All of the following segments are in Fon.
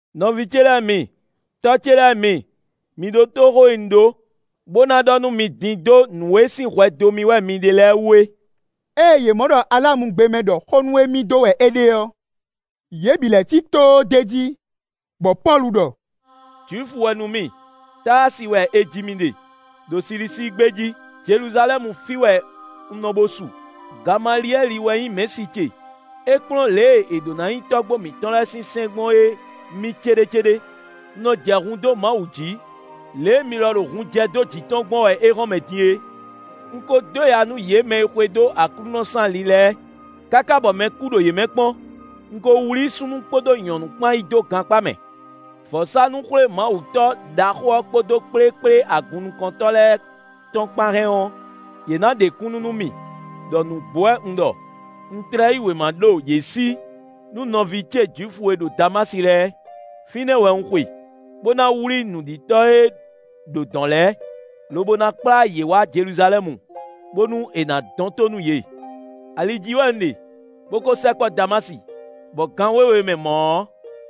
“Nɔví ce lɛ́ɛ mi; tɔ́ ce lɛ́ɛ mi, mi ɖótó xó e un ɖó, bó ná ɖɔ nú mi din dó nǔ e sín hwɛ dó mì wɛ mi ɖe lɛ́ɛ wú é.” Ée yě mɔ ɖɔ alamugbe mɛ ɖɔ xó nú émí dó wɛ é ɖe ɔ́, yě bǐ lɛ́ cí tóó d'é jí, bɔ Pɔ́lu ɖɔ: “Jwifu wɛ nú mì; Táasi wɛ è ji mì ɖe, ɖo Silisíi gbé jí, Jeluzalɛ́mu fí wɛ un nɔ bo su; Gamaliyɛ́li wɛ nyí mɛ̌si ce; é kplɔ́n lě e è ɖǒ ná nyi tɔ́gbó mǐtɔn lɛ́ɛ sín sɛ́n gbɔn é mì céɖécéɖé. Un nɔ jɛ hun dó Mawu jǐ, lě e mi lɔ ɖo hun jɛ dó jǐ tɔn gbɔn wɛ éhɔ́nmɛ din é. Un ko dó ya nú yě mɛ e xwedó Aklúnɔ sín ali lɛ́ɛ, káká bɔ mɛ kú ɖo yě mɛ kpɔ́n; un ko wlí súnnu kpódó nyɔ̌nu kpán yi dó gankpá mɛ. Vɔ̌sánú-xwlémawutɔ́ ɖaxó ɔ́ kpódó kplékplé agunnukɔntɔ́ lɛ́ɛ tɔn kpán hɛn ɔ́, yě nǎ ɖe kúnnu nú mì ɖɔ nǔgbó wɛ un ɖɔ; un tlɛ yí wěma ɖo yě sí nú nɔví ce Jwifu e ɖo Damási lɛ́ɛ; fínɛ́ wɛ un xwe, bó ná wlí nǔɖitɔ́ e ɖo dɔ̌n lɛ́ɛ, lobo ná kplá yě wá Jeluzalɛ́mu, bónú è nǎ dɔn tó nú yě.” “Ali jí wɛ un ɖe, bó kó sɛkpɔ́ Damási, bɔ gǎn wěwe mɛ mɔ̌ ɔ́,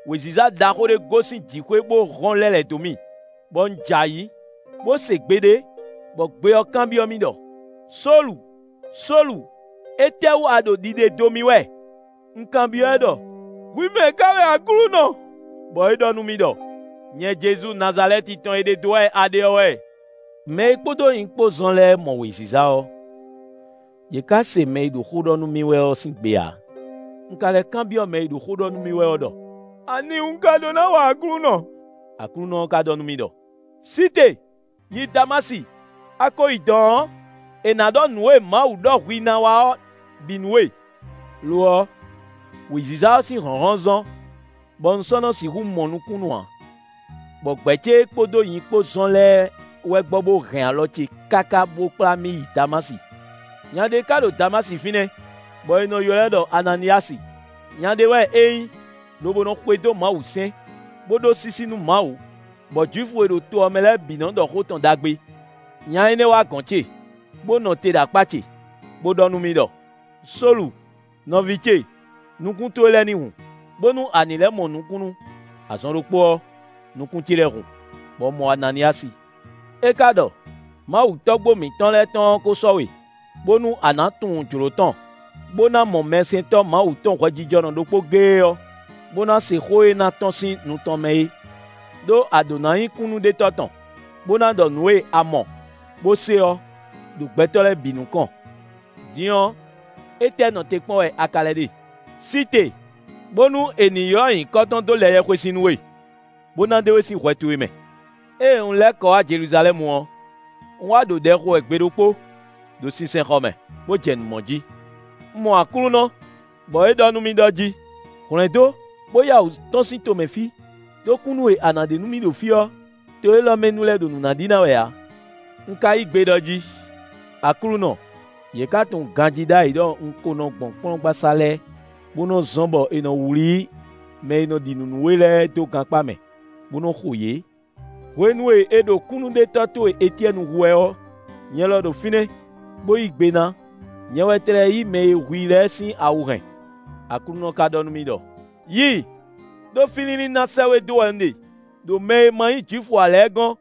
wěziza ɖaxó ɖé gosín jǐxwé bó hɔ́n lɛ́ lɛ̌ dó mì, bɔ un jɛ ayǐ, bó se gbe ɖé, bɔ gbe ɔ́ kanbyɔ́ mì ɖɔ: ‘Sólu! Sólu! Étɛ́wú a ɖo ɖiɖe dó mì wɛ?’ Un kanbyɔ́ ɛ ɖɔ: ‘Hwi mɛ̌ ká wɛ Aklúnɔ?’ Bɔ é ɖɔ nú mì ɖɔ: ‘Nyɛ Jezu Nazalɛ́ti tɔn e ɖe dó wɛ a ɖe ɔ́ wɛ.’ Mɛ e kpódó nyi kpó zɔ́n lɛ́ɛ mɔ wěziza ɔ́, yě ka se mɛ e ɖo xó ɖɔ nú mì wɛ ɔ́ sín gbe ǎ. Un ka lɛ́ kanbyɔ́ mɛ e ɖo xó ɖɔ nú mì wɛ ɔ́ ɖɔ: ‘Ani un ɖó ná wa Aklúnɔ?’ Aklúnɔ ɔ́ ká ɖɔ nú mì ɖɔ: ‘Sí te, yi Damási; a ko yi dɔ̌n ɔ́, è nǎ ɖɔ nǔ e Mawu ɖɔ hwi ná wa ɔ́ bǐ nú we.’ Lo ɔ́, wěziza ɔ́ sín hlɔ̌nhlɔ́n zɔ́n, bɔ un sɔ́ nɔ sixú mɔ nukúnnú ǎ, bɔ gbɛ̌ ce e kpódó nyi kpó zɔn lɛ́ɛ wɛ gbɔ bo hɛn alɔ ce káká bo kplá mì yi Damási. “Nya ɖé ka ɖo Damási fínɛ́, bɔ è nɔ ylɔ́ ɛ ɖɔ Ananíyasi; nya ɖé wɛ é nyí, lobo nɔ xwedó Mawusɛ́n, bó ɖó sísí nú Mawu, bɔ Jwifu e ɖo to ɔ́ mɛ lɛ́ɛ bǐ nɔ ɖɔ xó tɔn ɖagbe. Nya énɛ́ wá gɔ̌n ce, bó nɔ te ɖo akpá ce, bó ɖɔ nú mì ɖɔ: ‘Sólu, nɔví ce, nukún towe lɛ́ɛ ní hun, bónú a ní lɛ́ mɔ nukúnnú.’ Azɔn ɖokpó ɔ́, nukún ce lɛ́ɛ hun, bɔ un mɔ Ananíyasi. É ka ɖɔ: ‘Mawu tɔ́gbó mǐtɔn lɛ́ɛ tɔn ɔ́ ko sɔ́ we, bónú a na tunwun jló tɔn, bó ná mɔ mɛsɛntɔ́ Mawu tɔn hwɛjijɔnɔ ɖokpó géé ɔ́, bó ná se xó e na tɔ́n sín nu tɔn mɛ é. Đó a ɖǒ na nyí kúnnuɖetɔ́ tɔn, bó ná ɖɔ nǔ e a mɔ, bó se ɔ́, ɖo gbɛtɔ́ lɛ́ɛ bǐ nukɔn. Din ɔ́, étɛ́ nɔ te kpɔ́n wɛ a ka lɛ́ ɖe? Sí te, bónú è nǐ ylɔ́ nyǐkɔ tɔn dó lɛ yɛhwesin nú we, bó ná ɖe we sín hwɛ towe mɛ.’” “Ée un lɛ́ kɔ wá Jeluzalɛ́mu ɔ́, un wá ɖo ɖɛ xo wɛ gbe ɖokpó, ɖo sinsɛnxɔ mɛ, bó jɛ nǔ mɔ jí. Un mɔ Aklúnɔ, bɔ é ɖɔ nú mì ɖɔ jí: ‘Hwlɛ̌ndó, bó yá wǔ tɔ́n sín tomɛ fí, ɖó kúnnu e a nǎ ɖe nú mì ɖo fí ɔ́, to élɔ́ mɛ nu lɛ́ɛ ɖo nǔ ná ɖi ná wɛ ǎ.’ Un ka yí gbe ɖɔ jí: ‘Aklúnɔ, yě ka tunwun ganjí ɖ'ayǐ ɖɔ un ko nɔ gbɔn kplɔ́ngbasá lɛ́ɛ, bó nɔ́ zɔ́n bɔ è nɔ wlí mɛ e nɔ ɖi nǔ nú we lɛ́ɛ dó gankpá mɛ, bó nɔ́ xo yě. Hwenu e è ɖo kúnnuɖetɔ́ towe Etyɛ́ni hu wɛ ɔ́, nyɛ lɔ ɖo fínɛ́, bó yí gbe ná; nyɛ wɛ tlɛ yí mɛ e hu i lɛ́ɛ sín awu hɛn.’ Aklúnɔ ka ɖɔ nú mì ɖɔ: ‘Yi, ɖó fí línlín ná sɛ́ we dó wɛ un ɖe, ɖo mɛ e ma nyí Jwifu ǎ lɛ́ɛ gɔ́n.’”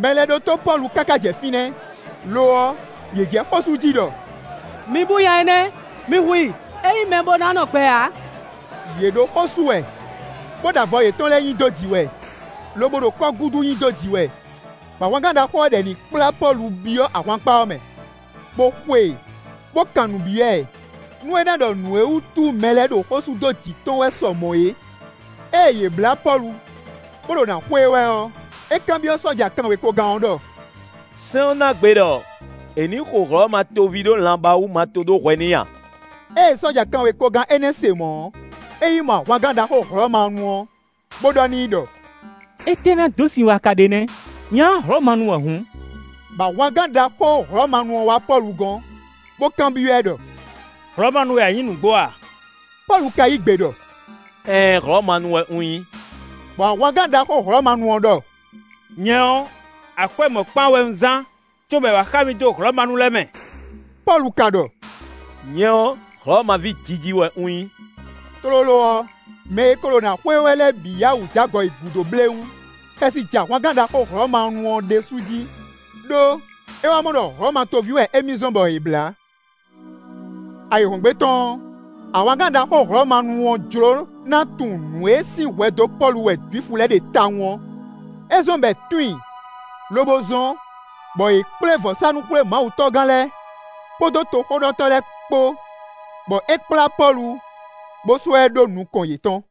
Mɛ lɛ́ɛ ɖótó Pɔ́lu káká jɛ fínɛ́, lo ɔ́, yě jɛ xó sú jí ɖɔ: “Mi bú nya énɛ́; mi hu i; é nyí mɛ bó ná nɔ gbɛ ǎ!” Yě ɖo xó sú wɛ, bó ɖo avɔ yětɔn lɛ́ɛ nyi dó jǐ wɛ, lobo ɖo kɔ́gúdu nyi dó jǐ wɛ; bɔ ahwangán ɖaxó ɔ́ ɖɔ è ní kplá Pɔ́lu byɔ́ ahwankpá ɔ́ mɛ, bó xo e, bó kan nǔ byɔ́ ɛ, nú é ná ɖɔ nǔ e wútu mɛ lɛ́ɛ ɖo xó sú dó jǐ tɔn wɛ sɔ mɔ̌ é. Ée yě blá Pɔ́lu, bó ɖo nǎ xó e wɛ ɔ́, é kanbyɔ́ sɔ́ja kanwekogán ɔ́ ɖɔ: “Sɛ́n ɔ́ ná gbe ɖɔ è ní xo Hlɔ̌ma toví ɖó lanbá wú ma to ɖó hwɛ n'i a?” Ée sɔ́ja kanwekogán énɛ́ se mɔ̌ ɔ́, é yi mɔ ahwangán ɖaxó Hlɔ̌manu ɔ́, bó ɖɔ n'i ɖɔ: “Étɛ́ ná dó sin wɛ a ka ɖe nɛ́? Nya ɔ́ Hlɔ̌manu wɛ hǔn.” Bɔ ahwangán ɖaxó Hlɔ̌manu ɔ́ wá Pɔ́lu gɔ́n, bó kanbyɔ́ ɛ ɖɔ: “Hlɔ̌manu wɛ a nyǐ nǔgbó a?” Pɔ́lu ka yí gbe ɖɔ: “Ɛɛn Hlɔ̌manu wɛ un nyí.” Bɔ ahwangán ɖaxó Hlɔ̌manu ɔ́ ɖɔ: “Nyɛ ɔ́, akwɛ́ mɔ̌kpán wɛ un zán, cóbɔ è wǎ xa mì dó Hlɔ̌manu lɛ́ɛ mɛ.” Pɔ́lu ka ɖɔ: “Nyɛ ɔ́, Hlɔ̌ma ví jiji wɛ un nyí.” Tlóló ɔ́, mɛ e ko ɖo nǎ xo e wɛ lɛ́ɛ bǐ yá wǔ jó agɔ yi gǔdo bléwún. Xɛsi jɛ ahwangán ɖaxó Hlɔ̌manu ɔ́ ɖésú jí, ɖó é wá mɔ ɖɔ Hlɔ̌ma toví wɛ émí zɔ́n bɔ è blǎ. Ayǐhɔ́ngbe tɔn ɔ́, ahwangán ɖaxó Hlɔ̌manu ɔ́ jló ná tunwun nǔ e sín hwɛ dó Pɔ́lu wɛ Jwifu lɛ́ɛ ɖe tawun ɔ́; é zɔ́n bɔ è tun i, lobo zɔ́n, bɔ è kplé vɔ̌sánú-xwlémawutɔ́gán lɛ́ɛ kpódó toxóɖɔtɔ́ lɛ́ɛ kpó, bɔ é kplá Pɔ́lu, bó sɔ́ ɛ ɖó nukɔn yětɔn.